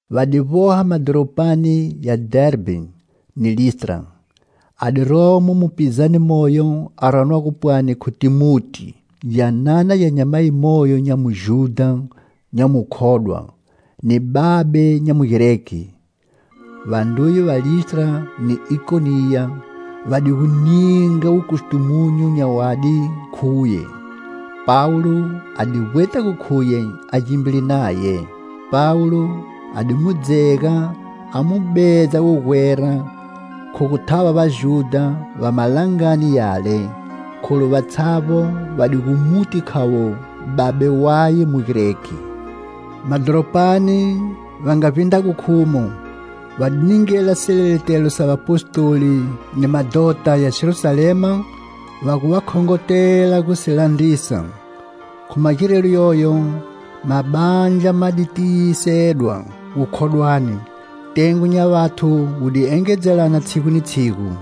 Va di vboha madhoropani ya Dherbhe ni Listra. A di romo mupizane moyo a ranwago pwani khu Thimoti, gyanana gya nyamayi moyo nya Mujudha nya mukhodwa, ni babe nya Mugreki. Vandruye va Listra ni Ikoniya va di gu ninga wukustumunyu nya wadi khu uye. Pawulo a di vbweta gu khuye a gimbile naye. Pawulo a di mu dzega a mu bedza wugwera khu gu thava Vajudha va malangani yale, kholu vatshavbo va di gu muti khavo babe waye Mugreki. Madhoropani va nga vbindrago khumo, va di ningela sileletelo sa vapostoli ni madhota ya Jerusalema, va gu va khongotela gu si landrisa. Khu magirelo yoyo, mabandla ma di tiyisedwa gukhodwani, tengo nya vathu wu di engedzelana tshigu ni tshigu.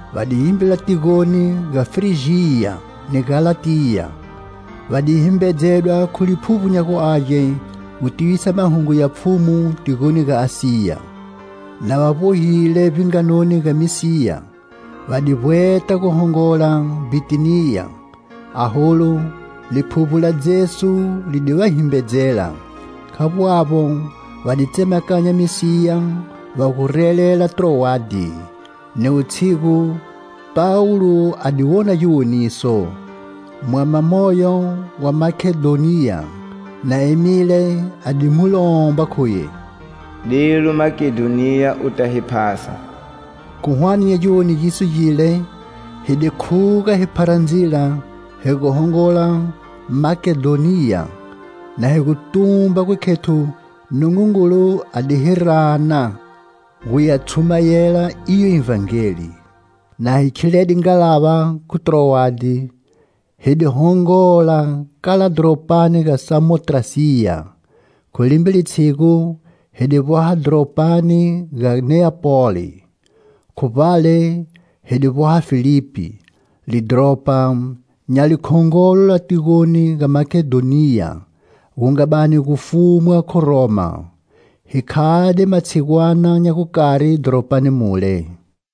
Va di gimbila tigoni ga Frijiya ni Galatiya; va di himbedzwa khu Liphuvbo nya gu Age gu tivisa mahungu ya Pfhumu tigoni ga Asiya. Na va vbohile vbinganoni ga Misiya, va di vbweta gu hongola Bhitiniya, aholu, Liphuvbo la Jesu li di va himbedzela. Khavbo avbo, va di tsemakanya Misiya va gu relela Trowade. Ni wutshigu, Pawulo a di wona giwoniso: mwama moyo wa Makedhoniya na emile a di mu lomba khuye: "Delu Makedhoniya u ta hi phasa" Khu hwane nya giwoniso gile, hi di khuga hi phara ndzila hi gu hongola Makedhoniya na hi gu tumba gu khethu Nungungulu a di hi rana gu ya tshumayela iyo Ivhangeli. Na hi khilede ngalava khu Trowade, hi di hongola kala dhoropani ga Samotrasiya, khu limbe litshigu hi di vboha dhoropani ga Neapoli. Khu vbale hi di vboha Filipi, lidhoropa nya likhongolo la tigoni ga Makedhoniya gu nga bani gu fumwa khu Roma. Hi khade matshigwana nya gukari dhoropani mule.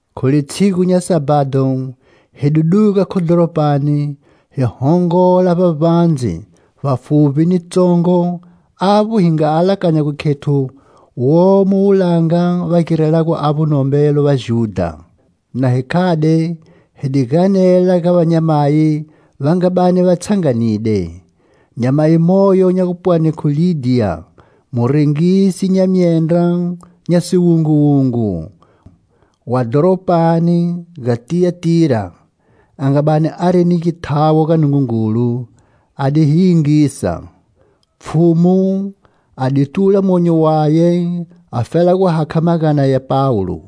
Khu litshigu nya sabhado hi di duga khu dhoropani hi hongola vbavbandze vbafuvbi ni tsongo avbo hi nga alakanya gu khethu womo wulanga va girelago avbo nombelo Vajudha. Na hi khade, hi di ganela ga vanyamayi va nga bani va tshanganide. Nyamayi moyo nya gupwani khu Lidhiya, murengisi nya myendra nya siwunguwungu, wa dhoropani ga Tiyatira, a nga bani ari ni githawo ga Nungungulu, a di hi yingisa. Pfhumu a di tula monyo waye afela gu hakha magana ya Pawulo.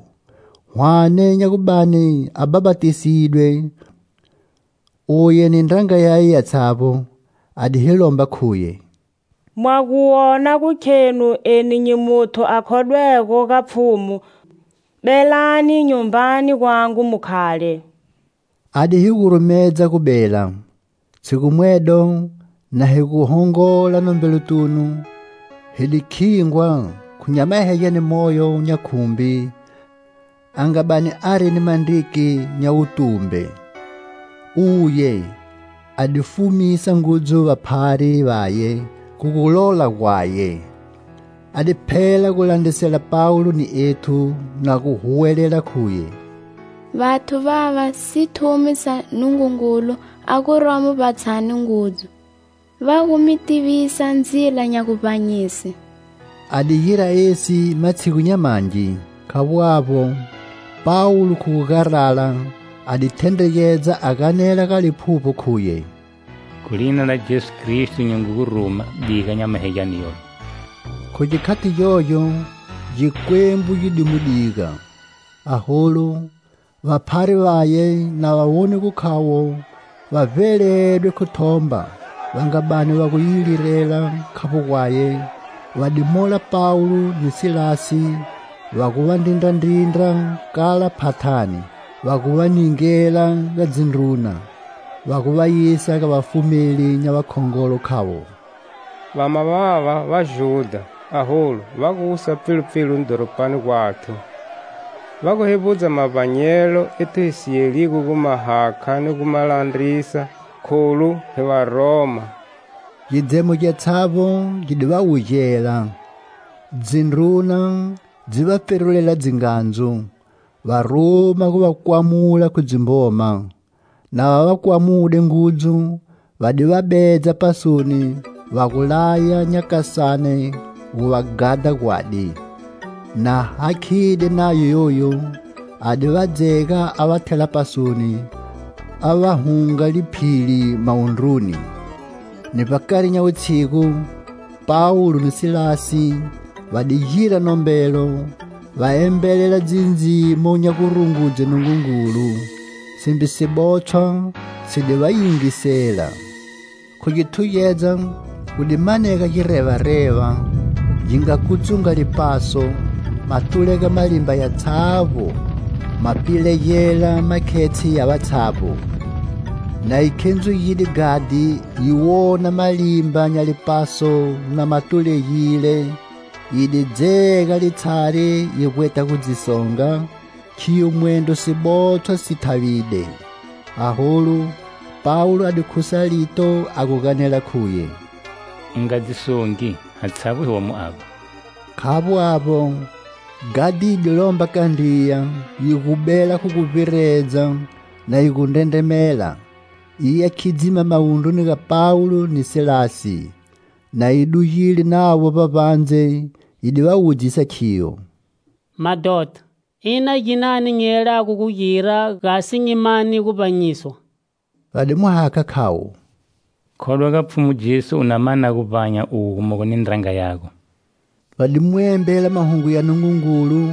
Hwane nya gu bani a bhapatisidwe uye ni ndranga yaye yatshavbo, a di hi lomba khuye: "Mwa gu wona gu khenu eni nyi muthu a khodwego ga Pfhumu, belani nyumbani gwangu mu khale." A di hi gurumedza gu bela. Tshigu mwedo, na hi gu hongola nombelotunu, hi di khingwa khu nyamahegyane moyo nya khumbi, a nga bani ari ni mandriki nya wutumbe; uye a di fumisa ngudzu vaphari vaye khu gulola gwaye. A di phela gulandrisela Pawulo ni ethu, na gu huwelela khuye: "Vathu vava sithumi sa Nungungulu a guromo vbatshani ngudzu, va gu mi tivisa ndzila nya guvbanyise." A di gira esi matshigu nya mangi. Khavbo avbo, Pawulo khu gu garala a di thendregedza a ganela ga liphuvbo khuye: "Khu lina la Jesu Kristo nyi ngu gu ruma: diga nyamahegyane yoyo." Khu gikhati gyogyo gikwembu gi di mu diga. Aholu, vaphari vaye na va wone gu khavo va vbeledwe khu thomba va nga bani va gu yi lirela khavbo gwaye, va di mola Pawulo ni Silasi va gu va ndrindrandrindra kala phathani, va gu va ningela ga dzindruna: va gu va yisa ga vafumeli nya vakhongolo, khavo: "Vama vava Vajudha, aholu va gu wusa pfilupfilu dhoropani gwathu; Va gu hevbudza mavbanyelo ethu hi si yeligo gu ma hakha ni gu ma landrisa, kholu hi varoma." Gidzemo gyatshavbo gi di va wugela, dzindruna dzi va pferulela dzingandzu, va ruma gu va kwamula khu dzimboma. Na va va kwamude ngudzu va di va bedza pasoni, va gu laya nyakasane gu va ghadha gwadi. Na hakhide nayo yoyu, a di va dzega a va thela pasoni, a va hunga liphili mawundru ni. Ni vbakari nya wutshigu, Pawulo ni Silasi va di gira nombelo, va embelela dzindzimo nya gurungudze Nungungulu, simbe sibotshwa si di va yingisela. Khu githugedza gu di manega girevareva, gi nga kutsunga lipaso, ma tulega malimba yatshavbo, ma pilegela makhetshe ya vatshavbo. Na yi khendzugide ghadhi yi wona malimba nya lipaso na ma tulegile yi di dzega litshari yi vbweta gu dzi songa, khiyo mwendro sibotshwa si thavide. Aholu, Pawulo a di khusa lito a gu ganela khuye: "U nga dzi songi, hatshavbo hi womo avba." Khavbo avbo, ghadhi yi di lomba kandriya yi gu bela khu guvbiredza na yi gu ndrendremela, yi ya khidzima mawundruni ga Pawulo ni Silasi. Na yi dugile navo vbavbandze yi di va wudzisa khiyo: "Madhota, ina ginani nyi yelago gu gira gasi nyi mane guvbanyiswa." Va di mu hakha khavo: "Khodwa ga Pfhumu Jesu u na mana guvbanya uwe gumogo ni ndranga yago." Va di mu embela mahungu ya Nungungulu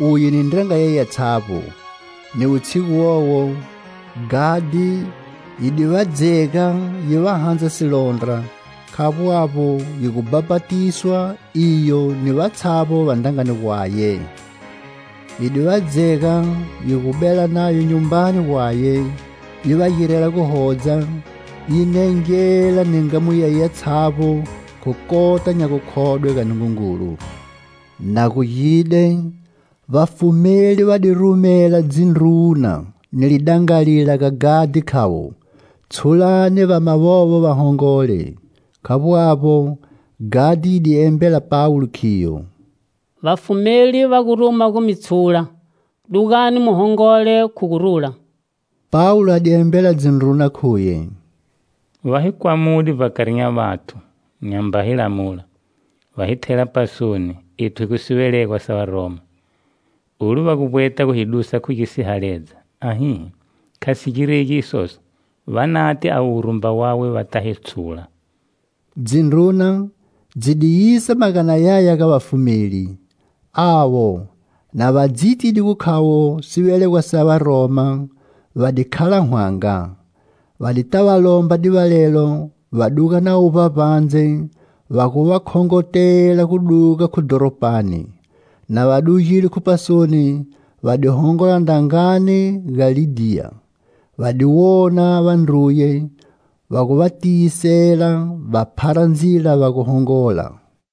uye ni ndranga yaye yatshavbo. Ni wutshigu wowo, ghadhi yi di va dzega yi va handza silondra, khavbo avbo yi gu bhapatiswa iyo ni vatshavbo va ndrangani gwaye. Yi di va dzega yi gu bela navo nyumbani gwaye, yi va girela guhodza, yi nengela ni ngamu yaye yatshavbo khu kota nya gukhodwe ga Nungungulu. Na gugide, vafumeli va di rumela dzindruna ni lidangalila ga ghadhi khavo: "Tshulani vama vovo va hongole." Khavbo avbo, ghadhi yi di embela Pawulo khiyo: "Vafumeli va gu ruma gu mi tshula, dugani mu hongole khu gurula." Pawulo a di embela dzindruna khuye: "Va hi kwamude vbakari nya vathu, nyamba hi lamula, va hi thela pasoni, ethu hi gu sivelegwa sa Varoma. Olu va gu vbweta gu hi dusa khu gisihaledza! Ahihi! Kha si giregi isoso, va nate avo wurumba wawe va ta hi tshula." Dzindruna dzi di yisa magana yaya ga vafumeli. Avo, na va dzitide gu khavo sivelegwa sa Varoma, va di khala hwanga. Va di ta va lomba divalelo, va duga navo vbavbandze, va gu va khongotela gu duga khu dhoropani. Na va dugile khu pasoni, va di hongola ndrangani ga Lidhiya, va di wona vandruye, va gu va tiyisela, va phara ndzila va gu hongola.